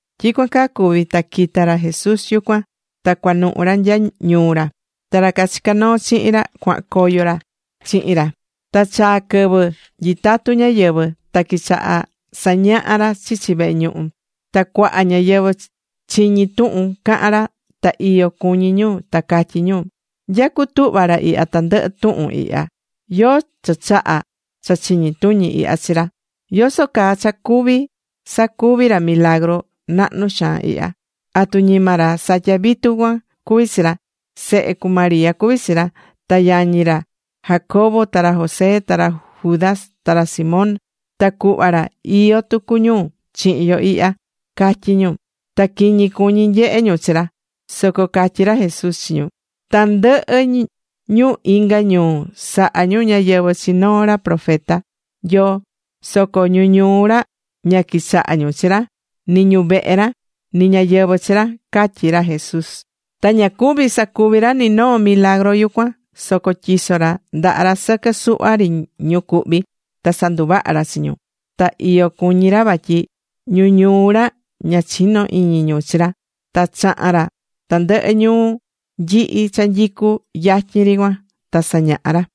Tyicuan caa cuvi̱ ta quita̱ ra Jesús yucuan, ta cuanuhu ra nya ñuu ra. Ta ra cachicá noo chihin ra cuahan coyo ra chihin ra. Ta chaa̱ quɨvɨ nyitatu ñáyɨvɨ, ta quichaha̱ sañaha ra chichi vehe ñuhu. Ta cuaha ñáyɨvɨ chiñi̱ tuhun cahán ra, ta iyo cuñí ñu, ta catyí ñu: ―¿Nya cutuhva̱ ra ihya tandɨhɨ tuhun ihya? ¿Yóó cha chaha̱ cha chiñi tuñi ihya chi ra? ¿Yoso caa cha cuví sacuvi ra milagru nahnu xaan ihya? ¿Atu ñima ra satyá vitu cuan cuví ra? Sehe cu María cuví chi ra. Ta yañi ra Jacobo, ta ra José, ta ra Judas, ta ra Simón, ta cuhva ra iyó tucu ñu chihin yo ihya ―catyi ñu. Ta quiñi cuñí ñu nyehe ñu chi ra. Soco catyí ra Jesús chi ñu: ―Tandɨhɨ ñu inga ñuu sahá ñu ñáyɨvɨ chi noo ra profeta Nyoo, soco ñu ñuu ra ña quichahá ñu chi ra, ni ñu vehe ra, ni ñáyɨvɨ chi ra ―catyí ra Jesús. Ta ña cuvi̱ sacuvi ra ni noo milagru yucuan, soco tyiso̱ ra ndaha ra sɨquɨ suhva ri ñu cuhví, ta sanduvaha̱ ra chi ñu. Ta iyo cuñí ra vatyi ñu ñuu ra ña chinó iñi ñu chi ra. Ta chaha̱n ra tandɨhɨ ñuu nyihi cha nyicú yatyin ri cuan, ta sañaha̱ ra.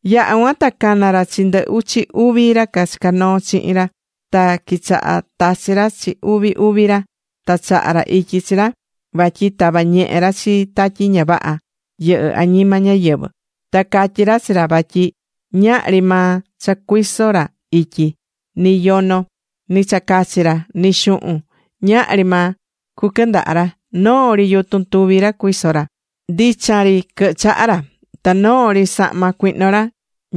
Yaha̱ cuan ta cana̱ ra chi ndɨ uchi uvi ra chicá noo chihin ra, ta quichaha̱ tachi ra chi uvi uvi ra. Ta chaha̱ ra ityi chi ra vatyi tava ñehe ra chi tatyi ña vaha yɨhɨ́ añima ñáyɨvɨ. Ta catyi̱ ra chi ra vatyi ñahri maa cha cacuiso ra ityi. Ni yono, ni cha cachi ra, ni xuhun. Ñahri maa cuquɨndaha ra, noo ri yutun tuvi ra cuiso ra. Ndichan ri quɨhɨ chaha ra. Ta noo ri sahma cuihno ra,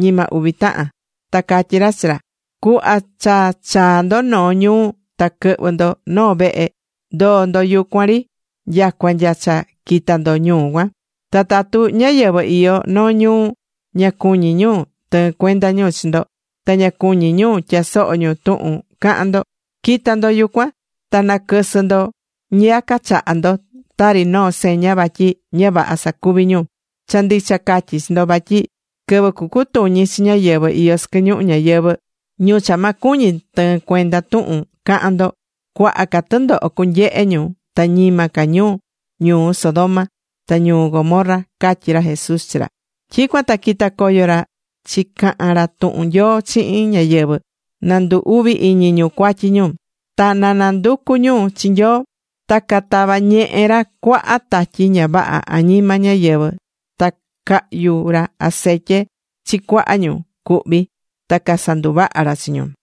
ñima uvi tahan. Ta catyí ra chi ra: ―Cuhva cha chaa ndo noo ñuu ta quɨhvɨ ndo noo vehe, ndo̱o ndo yucuan ri nyacua nya cha quita ndo ñuu cuan. Ta tatu ñáyɨvɨ iyó noo ñuu, ña cuñí ñu tɨɨn cuenda ñu chi ndo, ta ña cuñí ñu tyasoho ñu tuhun cahan ndo, qui̱ta ndo yucuan ta na̱quɨsɨ ndo ñiyaca chaha ndo tari noo seña vatyi ña vaha sacuví ñu. Cha ndicha catyí chi ndo, vatyi quɨvɨ cucutuñi chi ñáyɨvɨ iyó sɨquɨ ñuhu ñayɨvɨ̱, ñu cha ma cuñi tɨɨn cuenda tuhun cahan ndo, cuaha ca tɨndoho cunyehe ñu, ta ñima ca ñu ñuu Sodoma ta ñuu Gomorra ―catyí ra Jesús chi ra. Tyicuan ta quita̱ coyo ra ta chicaha̱n ra tuhun Nyoo chihin ñáyɨvɨ na ndu uvi iñi ñu cuatyi ñu, ta na nanducu ñu chi Nyoo. Ta catava̱ ñehe ra cuaha tatyi ña vaha añima ñáyɨvɨ. Ta cahyu̱ ra acetye chi cuaha ñu cuhví ta casanduvaha̱ ra chi ñu.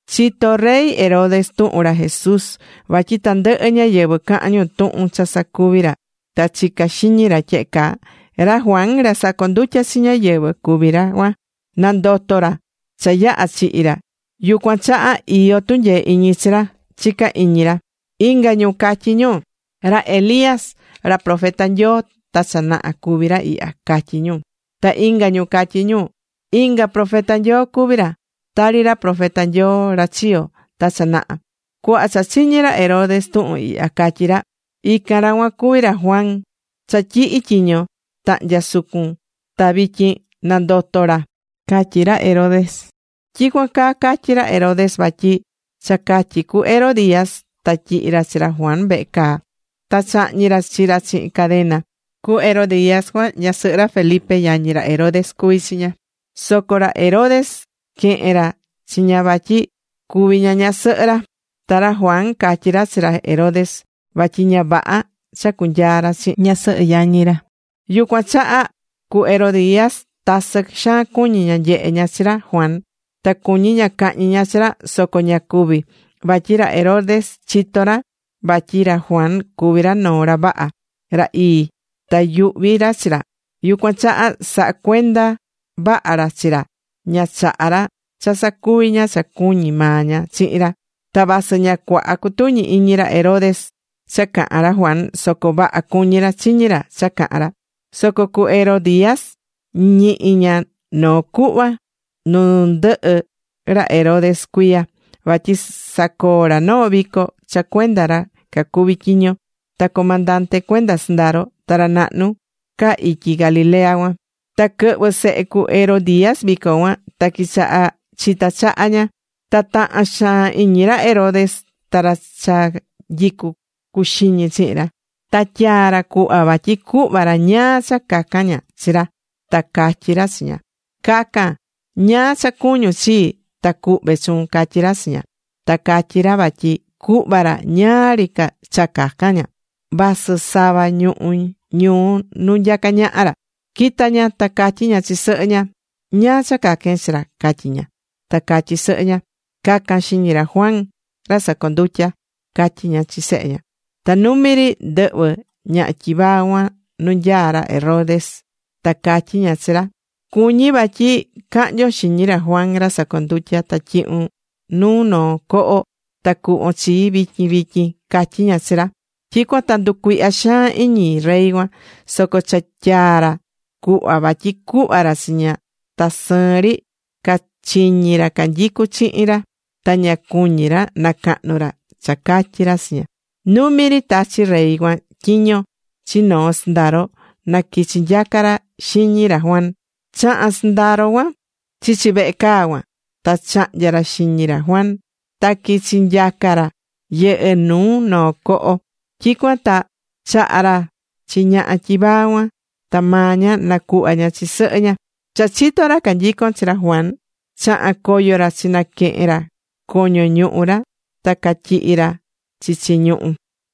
Chito̱ rey Herodes tuhun ra Jesús vatyi tandɨhɨ ñáyɨvɨ cahán ñu tuhun cha sacuví ra, ta chicá xiñi ra tyehe caa: ―Ra Juan ra sacondutya̱ chi ñáyɨvɨ cuví ra cuan. Nandoto̱ ra cha yaha̱ chihi̱ ra, yucuan chaha iyó tunyee iñi chi ra ―chicá iñi ra. Inga ñu catyí ñu: ―Ra Elías profeta Nyoo ta cha naha cuví ra ihya ―catyí ñu. Ta inga ñu catyí ñu: ―Inga profeta Nyoo cuví ra, tari ra profeta Nyoo ra chiyo̱ ta cha naha. Cuhva cha chiñi̱ ra Herodes tuhun ihya, catyí ra: ―Ican ra cuan cuví ra Juan cha tyihi̱ tyiño tahnya sucun, ta vityin nandoto̱ ra ―catyí ra Herodes. Tyicuan caa catyí ra Herodes vatyi cha catyi cu Herodías, ta tyihi̱ ra chi ra Juan vehe caa ta chahñi̱ ra chi ra chihin cadena. Cu Herodías cuan, ñasɨhɨ ra Felipe, yañi ra Herodes, cuví chi ña. Soco ra Herodes quehe̱n ra chi ña vatyi cuvi ña ñasɨhɨ ra. Ta ra Juan catyi̱ ra chi ra Herodes vatyi ña vaha cha cunyaa ra chihin ñasɨhɨ yañi ra. Yucuan chaha cu Herodías tasɨ xaan cuñí ña nyehe ña chi ra Juan, ta cuñí ña cahñi ña chi ra, soco ña cuví. Vatyi ra Herodes chitó ra vatyi ra Juan cuví ra noo ra vaha, ra ii, ta yuhví ra chi ra. Yucuan chaha sahá cuenda vaha ra chi ra, ña chaha̱ ra cha sacuvi ña cha cuñí maa ña chihin ra. Ta vasɨ ña cuaha cutuñi iñi ra Herodes cha cahán ra Juan soco vaha cuñí ra chiñí ra cha cahán ra. Soco cu Herodías ñihi̱ ña noo cuhva nu ndɨhɨ ra Herodes cuiya, vatyi sacoo̱ ra noo vico cha cuenda ra cacuví tyiño, ta comandante cuenda sɨndaro, ta ra nahnu ca ityi Galilea cuan. Ta quɨhvɨ̱ sehe cu Herodías vico cuan, ta quichaha chita̱ chaha ña. Ta taha̱n xaan iñi ra Herodes ta ra cha nyicú cuxiñi chihin ra. Ta tyaa ra cuhva vatyi cuhva ra ñáá cha cacan ña chi ra. Ta catyi ra chi ña: ―Ca̱can ñáá cha cuñún chii, ta cuhve chuun ―catyí ra chi ña. Ta catyí ra vatyi cuhva ra ñáá ri cha cacan ña, vasɨ sava ñuhú ñuu nu nyacá ñaha ra. Quita̱ ña ta catyí ña chi sɨhɨ ña: ―¿Ñáá cha caquen chi ra? ―catyí ña. Ta catyí sɨhɨ ña: ―Ca̱can xiñi ra Juan ra sacondutyá ―catyí ña chi sehe ña. Ta numi ri ndɨhvɨ̱ ñaha tyivaa cuan nu nyaá rey Herodes, ta catyí ña chi ra: ―Cuñí vatyi cahnyon xiñi ra Juan ra sacondutyá ta tyihun nuu noo coho ta cuhvon chii vityin vityin ―catyí ña chi ra. Tyicuan ta nducuihya̱ xaan iñi rey cuan. Soco cha tyaa ra cuhva vatyi cuhva ra chi ña, ta sɨɨn ri cachiñi̱ ra canyicú chihin ra, ta ña cuñí ra nacahnu ra cha catyi̱ ra chi ña. Numi ri tachi̱ rey cuan tyiño chi noo sɨndaro na quichi nyaca ra xiñi ra Juan. Chaha̱n sɨndaro cuan chichi vehe caa cuan, ta chahnya̱ ra xiñi ra Juan. Ta quichi̱ nyaca ra, yɨhɨ́ nu noo coho. Tyicuan ta chaha̱ ra chi ñaha tyivaa cuan, ta maa ña nacuhva̱ ña chi sɨhɨ ña. Cha chito̱ ra canyicón chi ra Juan, chaha̱n coyo ra chinaquehe̱n ra coño ñuhu ra, ta cachityihi̱ ra chichi ñuhú.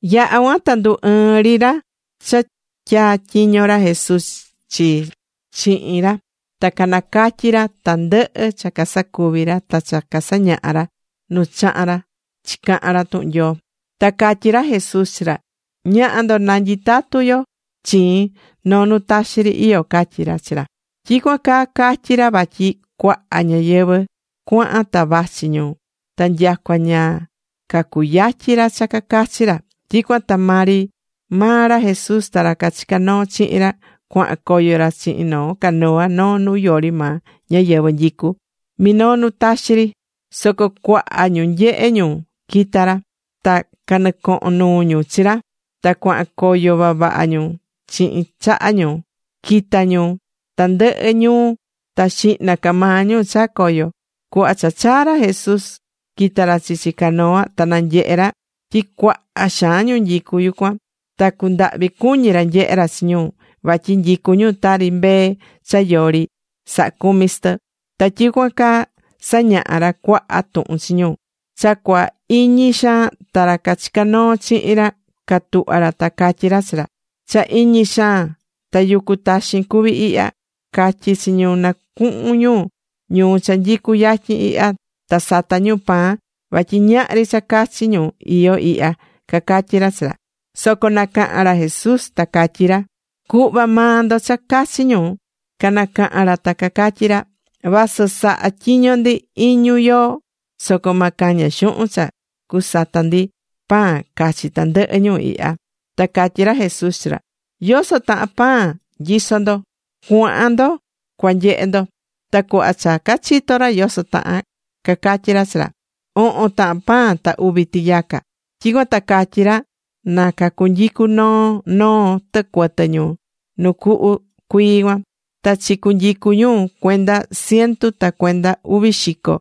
Yaha̱ cuan ta ndu ɨɨ̱n ri ra cha tyatyiño̱ ra Jesús chi chihin ra, ta canacatyi̱ ra tandɨhɨ cha casacuvi̱ ra, ta cha casañaha̱ ra nu chaha̱n ra chicahan ra tuhun Nyoo. Ta catyí ra Jesús chi ra: ―Ña̱ha ndo, na nyitatu yo chiin noo nu taxi ri iyó ―catyí ra chi ra. Tyicuan caa catyi̱ ra vatyi cuaha ñáyɨvɨ cuahan ta vachi ñu, ta nyacua ña cacuyatyi ra cha cacachi ra. Tyicuan ta maa ri maa ra Jesús ta ra cachicá noo chihin ra cuahan coyo ra chihin noo canoa noo nu yori maa ñáyɨvɨ nyicú, minoo nu taxi ri. Soco cuaha ñu nyehe̱ nu quitá ra. Ta canɨcohon nuu ñu chi ra. Ta cuahan coyo vavaha ñu chihin chaha ñu, quita̱ ñu tandɨhɨ ñuu ta xihna ca maa ñu chaa̱ coyo. Cuhva cha chaa̱ ra Jesús, quita̱ ra chichi canoa ta nanyehe̱ ra tyi cuaha xaan ñu nyicú yucuan. Ta cundahvi cuñí ra nyehé ra chi ñu, vatyi nyicú ñu tari mbee cha yori ra sahá cumi chi tɨ. Ta quichaha̱ sañaha ra cuaha tuhun chi ñu. Cha cua iñi xaan, ta ra cachicá noo chihin ra catuhva̱ ra ta catyí ra chi ra: ―Cha iñi xaan, ta yucu taxin cuví ihya. Ca̱tyi chi ñu, na cuhun ñu ñuu cha nyicú yatyin ihya, ta sata ñu pan, vatyi ñahri cha cachi ñu iyó ihya ―cacatyí ra chi ra. Soco nacaha̱n ra Jesús, ta catyí ra: ―Cu̱hva maa ndo cha cachi ñu. Canacaha̱n ra ta catyí ra: ―Vasɨ saha tyiño ndi iñu yoo, soco ma caña xuhun cha cusata ndi pan cachi tandɨhɨ ñu ihya. Ta catyí ra Jesús chi ra: ―¿Yoso tahan pan nyisó ndo? Cua̱han ndo cua nyehe ndo. Ta cuhva cha cachito̱ ra yoso tahan, cacatyí ra chi ra: ―Ohon tahan pan ta uvi tiyaca. Tyicuan ta catyi ra na cunyicú noo noo tɨcuɨtɨ ñu nu cuhu cuii cuan. Ta chicunyicu̱ ñu cuenda ciento ta cuenda uvi xico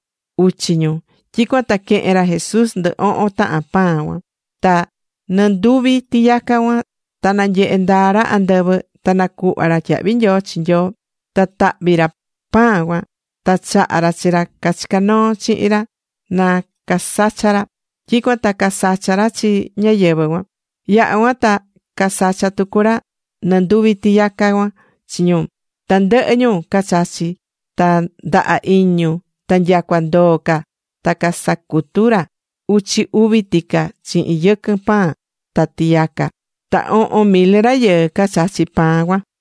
uchi ñu. Tyicuan ta quehe̱n ra Jesús ndɨ ohon tahan pan cuan ta nɨnduvi tiyaca cuan. Ta nanyehe̱ ndaa ra andɨvɨ, ta nacuhva̱ ra tyahvi nyoo chi Nyoo, ta tahvi̱ ra pan cuan, ta chaha̱ ra chi ra cachicá noo chihin ra na casacha ra. Tyicuan ta casacha̱ ra chi ñáyɨvɨ cuan. Yaha cuan ta casacha̱ tucu ra nɨnduvi tiyaca cuan chi ñu. Tandɨhɨ ñu cachachi̱ ta ndaha iñi ñu. Ta nyacua ndoo ca ta casacutu̱ ra uchi uvi tica chihin yɨquɨn pan ta tiyaca. Ta ohon mil rayɨɨ cachachi̱ pan cuan.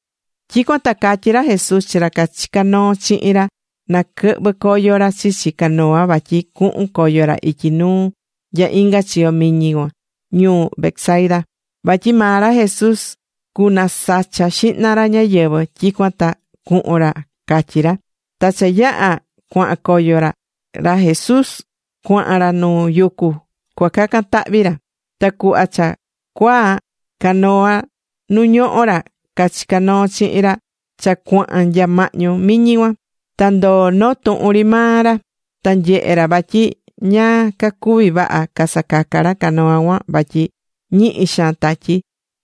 Tyicuan ta catyi̱ ra Jesus chi ra cachicá noo chihin ra na quɨhvɨ coyo ra chichi canoa vatyi cuhun coyo ra ityi nuu nya inga chiyo miñi cuan ñuu Betsaida. Vatyi maa ra Jesús cunasacha xihna ra ñáyɨvɨ, tyicuan ta cuhun ra catyi̱ ra. Ta cha yaha̱ cuahan coyo ra, ra Jesús cuahan ra nu yucu, cua cacan tahvi ra. Ta cuhva cha cuaa, canoa nu ñohó ra cachicá noo chihin ra cha cuahan nya mahñu miñi cuan, ta ndoo̱ noo tuhun ri maa ra. Ta nyehe̱ ra vatyi ña cacuví vaha casacaca ra canoa cuan vatyi ñihi xaan tatyi.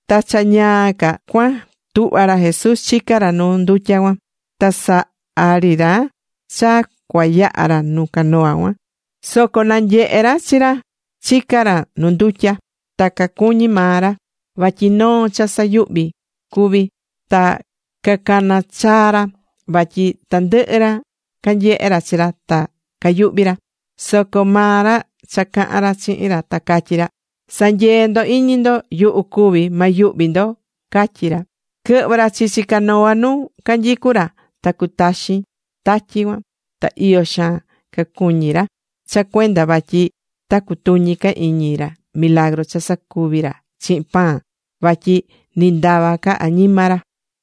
Ta cha ñaa ca cuan tuhva̱ ra Jesús chicá ra nu ndutya cuan. Ta saha̱ ri ra cha cua yaha ra nu canoa cuan. Soco cananyehe̱ ra chi ra, chicá ra nu ndutya. Ta cacuñi̱ maa ra vatyi noo cha sayuhvi cuví, ta cacana̱ chaa ra. Vatyi tandɨhɨ ra canyehe̱ ra chi ra ta cayuhvi̱ ra. Soco maa ra caha̱n ra chihin ra ta catyí ra: ―¡Sa̱nyee ndo iñi ndo! ¡Yuhu cuví! ¡Ma yuhvi ndo! ―catyí ra. Quɨhvɨ̱ ra chichi canoa nu canyicú ra, ta cutaxin tatyi cuan. Ta iyo xaan cacuñí ra cha cuenda vatyi ta cutuñi ca iñi ra milagru cha sacuvi̱ ra chihin pan, vatyi ni ndava ca añima ra.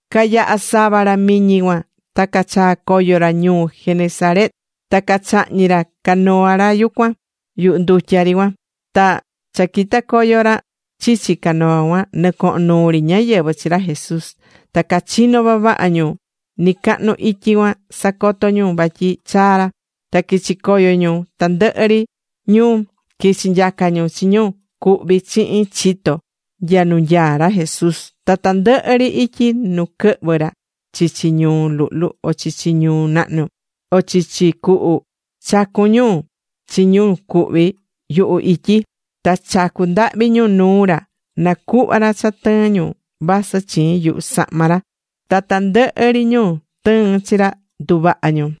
Cayaha̱ sava ra miñi cuan ta cachaa̱ coyo ra ñuu Genesaret, ta cachahñi̱ ra canoa cuan yuhu ndutya ri cuan. Ta cha quita̱ coyo ri ra chichi canoa cuan, nɨcohon nuu ri ñáyɨvɨ chi ra Jesús. Ta cachino̱ vavaha ñu nɨcahnu ityi cuan sacotó ñu vatyi chaa̱ ra. Ta quichi̱ coyo ñu tandɨhɨ ri ñuu, quichi̱ nyaca ñu chi ñu cuhví chihin chito nya nu nyaá ra Jesús. Ta tandɨhɨ ri ityi nu quɨhvɨ̱ ra chichi ñuu luhlu o chichi ñuu nahnu, o chichi cuhu, chacu̱n ñu chi ñu cuhví yuhu ityi. Ta chacu̱ ndahvi ñu nuu ra na cuhva ra cha tɨɨn ñu vasɨ chiin yuhu sahma ra. Ta tandɨhɨ ri ñu tɨɨ̱n chi ra, nduvaha̱ ñu.